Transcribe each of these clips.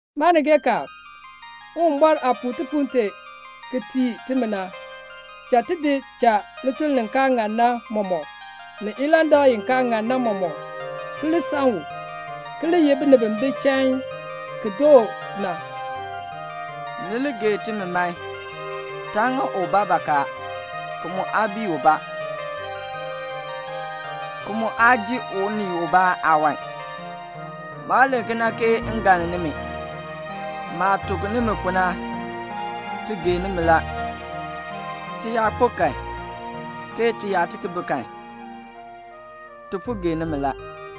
Maanigeekaan, Uwumbɔr aah puu tipuul tee ki tii timi na, cha ti di cha lituln li kaa ŋan na mɔmɔk, ni ilandak i kaa ŋan na mɔmɔk, ki li san u, ki li ye binib bi bi chain ki doo na. Ni li gee timi man. Taa ŋa ubaa bakaa, ki mu aa bii ubaa, ki mu aa ji unii ubaa aawan. Maa len kena ke m galn nimi. Maah tuk nimi pu na, ti gee nimi la. Ti yaa kpo kan, ke ti yaa bi kan, ti po gee nimi la.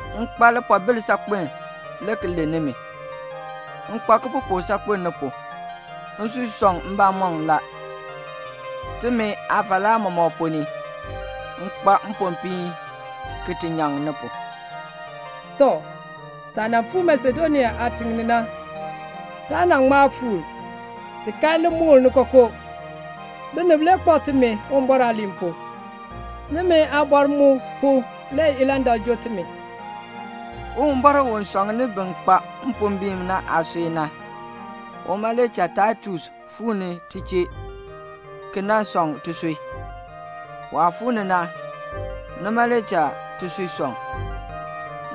M kpa lipoobil saakpen le ki len nimi. M kpa kipupuk saakpen ni pu. Nsui sɔŋ mbamɔm la. Timi aafalaa mɔmɔk ponn ni m kpa mpopiin ki ti nyaŋ ni pu. Tɔ, taah nan fuu Masedonia aatiŋ ni na, taa ŋma fuur. Ti kan limukl ni kookoo. Binib le kpak timi Uwumbɔr aaliin pu. Nimi aabɔr mu pu le ilandak joo timi. Uwumbɔr u sɔŋni bin kpa mpombiin na aasui na, uma le cha Taitus fuu ni ti chee ki nan sɔŋ tisui. Waah fuu ni na, nima le cha tisui sɔŋ.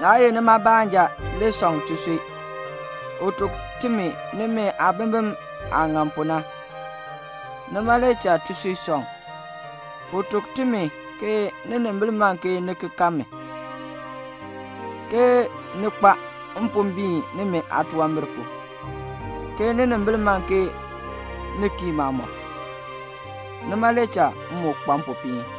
Naa ye nima baanja le sɔŋ tisui. U tuk timi nimi aabimbin aah ŋan pu na. Nima le cha tisui sɔŋ. U tuk timi ke ninimbil man ke ni ki kan mi, ke ni kpa mpombiin nimi aatunwambir pu, ke ninimbil man ke ni kii maamɔb. Nima le cha m moo kpa mpopiin.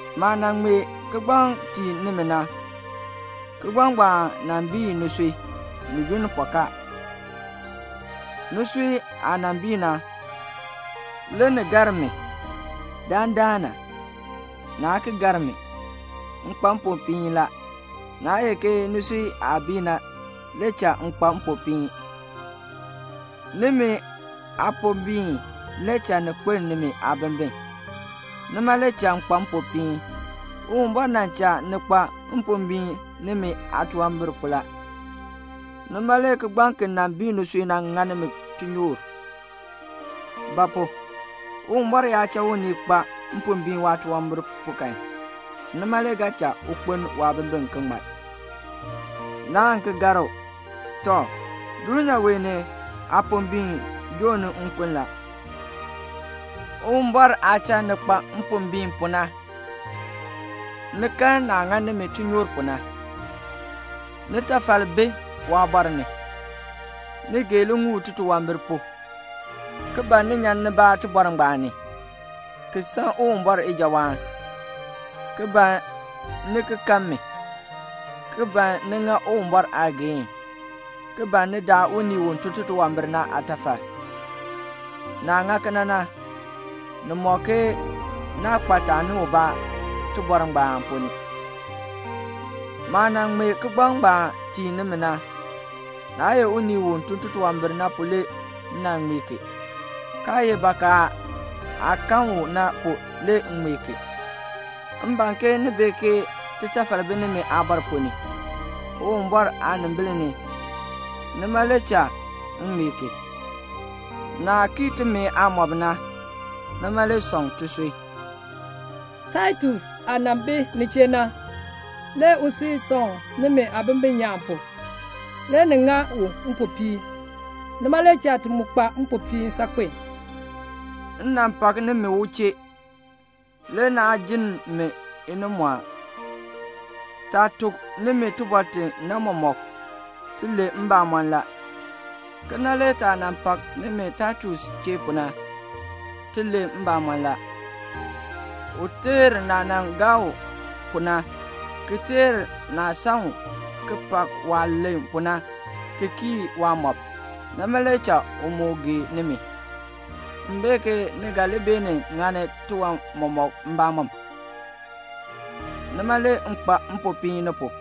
Maah nan ŋmee kigbaŋ tii nimi na, kigbaŋ ngbaan nan bii nisui ni yunn pɔkaa. Nisui aah nan bii na, le ni gar mi. Dandana, naa ki gar mi. M kpa mpopiin la. Naa ye ke nisui aah bii na le cha m kpa mpopiin. Nimi aapombiin le cha ni kpeln nimi aabimbin. Nima le cha m kpa mpopiin. Uwumbɔr nan cha ni kpa mpombiin nimi aatunwambir pu la. Nima le kigbaŋ ki nan bii nisui na ŋa nimi tinyoor. Ba pu? Uwumbɔr yaa cha unii kpa mpombiin waatunwambir pu kan, nima le ga cha u kpeln waabimbin ki ŋmar. Naan ki gar u. Tɔ, dulnyaa wee ni aapombiin joo ni nkun la. Uwumbɔr aah cha ni kpa mpombiin pu na, ni kan naah ŋa nimi tinyoor pu na. Nitafal bi waabɔr ni. Ni gee liŋuul titunwambir pu, ki ban ni nyan nibaa tibɔr ngbaan ni, ki san Uwumbɔr ijawaan, ki ban ni ki kan mi, ki ban ni ŋa Uwumbɔr aageehn, ki ban ni daa unii u tun titunwambir na aatafal. Naah ŋa kena na, ni mɔk ke naa kpa taani ubaa tibɔr ngbaan ponn ni. Maah nan ŋmee kigbaŋ ngbaan tii nimi na, naa ye unii u tun titunwambir na pu le m nan ŋmee ki, kaa ye bakaa aah kan u na pu le m ŋmee ki. M ban ke ni bee ke titafal bi nimi aabɔr ponn ni, Uwumbɔr aanimbil ni. Nima le cha m ŋmee ki. Naah kii timi aamɔb na, nima le sɔŋ tisui. Taitus aah nan bi ni chee na, le usui sɔŋ nimi aabimbin nyaan pu. Le ni ŋa u mpopiin. Nima le cha ti mu kpa mpopiin saakpen. M nan pak nimi u chee. Le naa jinn mi inimɔɔn. Taah tuk nimi tibɔr ti na mɔmɔk, ti len mbamɔn la. Kena le taah nan pak nimi Taitus chee pu na, ti len mbamɔn la. U teer naah nan gaa u pu na, ki teer naah san u, ki pak waah len pu na, ki kii waamɔb. Nima le cha u moo gee nimi. M bee ke ni ga li beenin ŋani tiwan mɔmɔk mbamɔm. Nima le m kpa mpopiin ni pu.